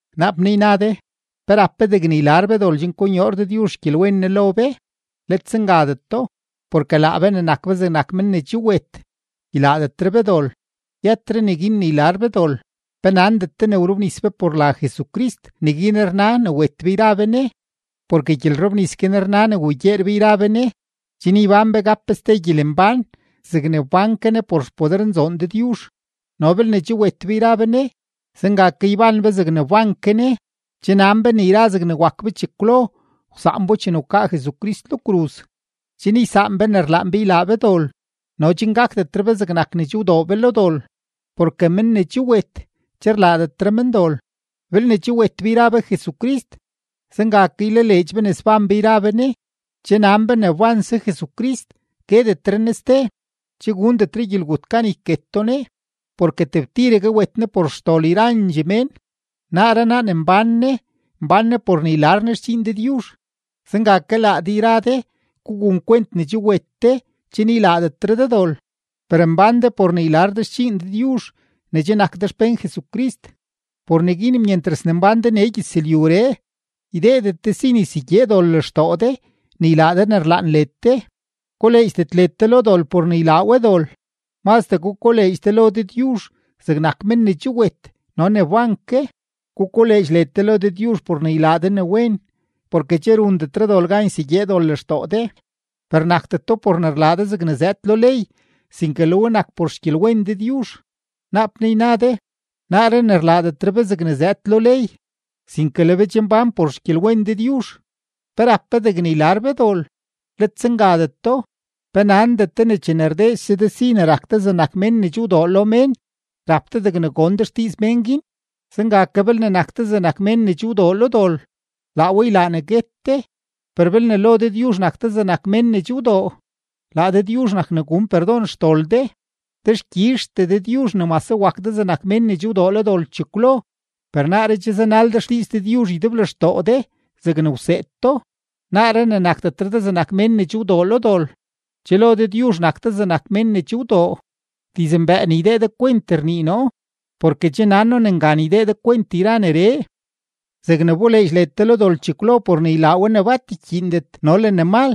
Naap naa yna de: “¿Pe rap be degne ylar be dol chen konyoor Dëdyuzh xgyelwen Ne lo be?” ¡Let zengadeto! Porke laa be ne nak be zegnak men ne che wet, ylaadetre be dol, yëtre neguin ne ylar be dol. ¿Pe nandet de ne wrobnis be por la Jesucrist, neguin rna ne wet be yra be Ne? Porke gyelrobnis guin rna ne wugyeer be yra be Ne, chen yban be gap be ste gyelembán zegne wban ke Ne por xpodernzoon Dëdyuzh. No belne che wet be yra be Ne, zenga ke yban be zegne wban ke Ne. Che nan be ne yra zegne wak be chekwlo wsaan bo chene wkaa Jesucrist lo kruz, chen ysaan be ne rlaan be ylaa be dol no chen gakdetre be zegnak ne che wdoo be lo dol. Porke men ne che wet, che rlaadetre men dol. Belne che wet be yra be Jesucrist, zenga ke ylaleedx be ne sbán be yra be Ne. Che nan be ne wbanse Jesucrist, guetetre Ne ste, che gundetre gyelgut gan yketo Ne. Porke tebtiregue wet Ne por xdol yrandxee mén. Naaree naa ne mbán Ne, mbán Ne por ne ylar Ne xdxiin Dëdyuzh. Zenga ke laa de yra de, gugun kwent ne che wet de chen ylaadetre de dol, per mbán de por ne ylaa de xdxiin Dëdyuzh ne che nak de xpén Jesucrist. Por neguin myentras ne mbán de nee gyëzlyuree, ydeedet de si ne ysegyee dol lextoo de ne ylaa de ne rlaan led de. Koleedxdet led de lo dol por ne ylaa we dol. Mazdee gukoleedx de lo Dëdyuzh zegnak men ne che wet no ne wban ke. Gukoleedx led de lo Dëdyuzh por ne ylaa de ne wen. Porke che rundetre dol gan ysegyee dol lextoo de, per nakdeto por ne rlaa de zegne ne zëëd lo ley, sinke le we nak por xgyelwen Dëdyuzh. Naap naa yna de: “Naaree ne rlaadetre be zegne zëëd lo ley, sinke le be che mbán por xgyelwen Dëdyuzh, ¿pe rap be degne ylar be dol?” ¡Let zengadeto! ¿Pe nandet de ne chene rdeese de si ne rak de zegnak mén ne che wdoo lo mén, rap de degne gon de xdiiz mén guin? Zenga ke belne nak de zegnak mén ne che wdoo lo dol, laa we ylaa ne guet de, per belne lo Dëdyuzh nak de zegnak mén che wdoo, laa Dëdyuzh nak ne gun perdon xdol de. Dexkyizhtee Dëdyuzh ne mase wak de zegnak mén ne che wdoo lo dol chekwlo, per naaree che zanal de xdiiz Dëdyuzh ydeblextoo de zegne wseed do. Naaree ne nakdetre de zegnak mén ne che wdoo lo dol, che lo Dëdyuzh nak de zegnak mén ne che wdoo. (Dizmbëë ne ydee de kwent rnii noo, porke che nan noo ne ngan ydee de kwent yra neree.) Zegne wboleedx led de lo dol chekwlo por ne ylaa we ne bat ykyiindet no le ne mal,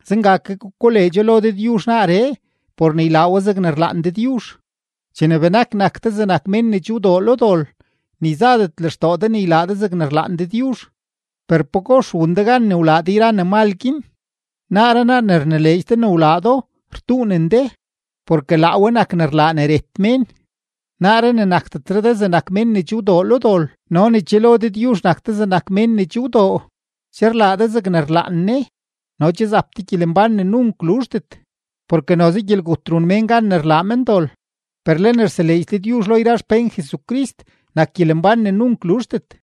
zenga ke gukoleedxo lo Dëdyuzh naaree, por ne ylaa we zegne rlaan Dëdyuzh. Chene benak nak de zegnak mén ne che wdoo lo dol, ni zadet lextoo de ne ylaa de zegne rlaan Dëdyuzh. Per, ¿pagox wun de gan ne wlaa de yra ne mal guin? Naaree naa ne rnileedx de ne wlaa do, rtuunen de. Porke laa we nak ne rlaa ne ret mén. Naaree ne nakdetre de zegnak mén ne che wdoo lo dol no ne che lo Dëdyuzh nak de zegnak mén ne che wdoo, che rlaa de zegne rlaan Ne no che zap de gyelembán ne nunk luzhdet. Porke noze gyelgut run mén gan ne rlaa men dol, per le ne rseleedx Dëdyuzh lo yra xpén Jesucrist nak gyelembán ne nunk luzhdet.